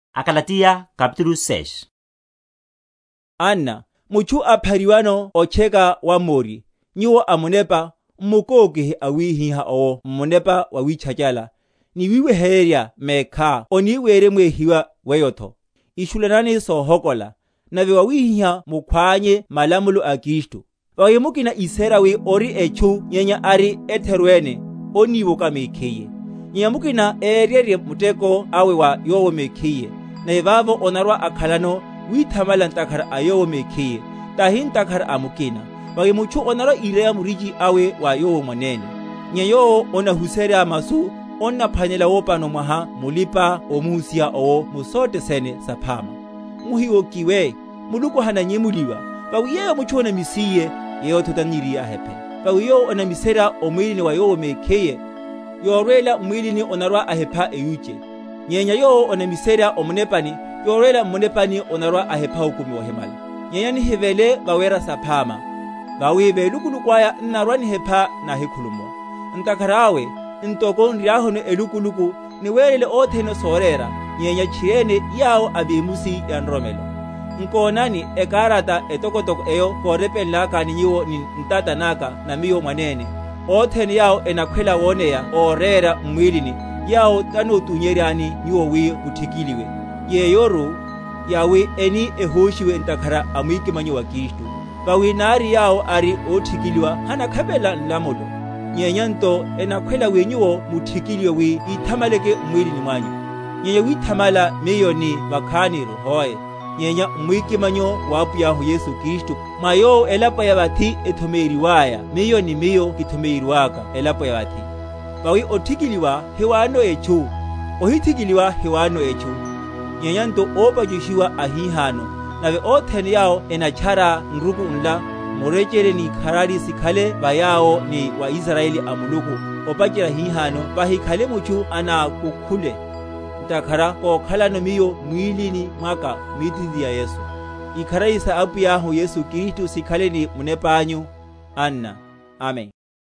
Solopola ni olochela. Anna, mutchu aphariwano otcheka wammori, nyuwo amunepa, m’mukókihe awihiha owo m’munepa wawítchachala; ni wiweheryerya mekhá oni weremwehiwa weyotho. Ishulanani sohokola, nave wawihihá mukhwánye malamulo a Kristu. Vawi mukina íséra wi ori etchu nyenya ari etheru ene, onniwoka mekhiye. Nyenya mukina éryerye muteko awe wa yowo mekhiye, nave vavo onarwa‐akhalano withamala ntakhara a yowo mekhiye, tahi ntakhara a mukina. Vawi mutchu onarwa‐ireya murichi awe wa yowo mwanene. Nyenya yowo onahuserya masu, onnaphwanela wopano mwaha mulipa‐omuhusiha owo mu sothe sene saphama. Muhiwokiwe; Muluku hananyemuliwa; vawi yeyo mutchu onamisiye, yeyotho taniriye ahephe. Vawi yowo onamiserya o mwílini wa yowo mekhiye, yorwela m’mwílini onarwa‐ahepha eyuche; nyenya yowo onamiserya o Munepani, yorwela m’munepani onarwa‐ahepha okumi wohimala. Nyenya nihivele vawera saphama; vawi velukuluku aya n’narwa‐nihepha náhikhulumuwa. Ntakhara awe, ntoko n’riahuno elukuluku, niwerele othene sorera, nyenya tchiriene yawo a vemusi ya nroromelo. Nkonani, ekarata etokotoko eyo kórepenlakani nyuwo ni ntata naka na miyo mwanene. Othene yawo enakhwela woneya órera m’mwilini, yawo tanótunyeryani nyuwo wi muthikiliwe: yeyoru, yawi eni ehóshiwe ntakhara a mwikimanyo wa Kristu. Vawi nari yawo ari óthikiliwa hanakhapelela nlamulo; nyenya nto enakhwela wi nyuwo muthikiliwe, wi yithamaleke m’mwílini mwanyu. Nyenya withamala miyo ni vakhaniru, hoe, nyenya m’mwikimanyo wa Apwiyahu Yesu Kristu, mwa Yowo elapo ya vathi ethomeyiweryaya miyo, ni miyo kithomeyiweryaka elapo ya vathi. Vawi othikiliwa hiwanono etchu, ohithikiliwa hiwanonotho etchu, nyenya nto ópachushiwa ahihano. Nave othene yawo enatchara nruku nla, murechele ni ikharari sikhale va yawo, ni va Israyeli a Muluku. Opacherya hihano vahikhale mutchu anákúkhule, ntakhara kokhalano miyo m’mwílini mwaka mítitiri ya Yesu. Ikharari sa Apwiyahu Yesu Kristu sikhale ni munepa anyu, anna. Amen.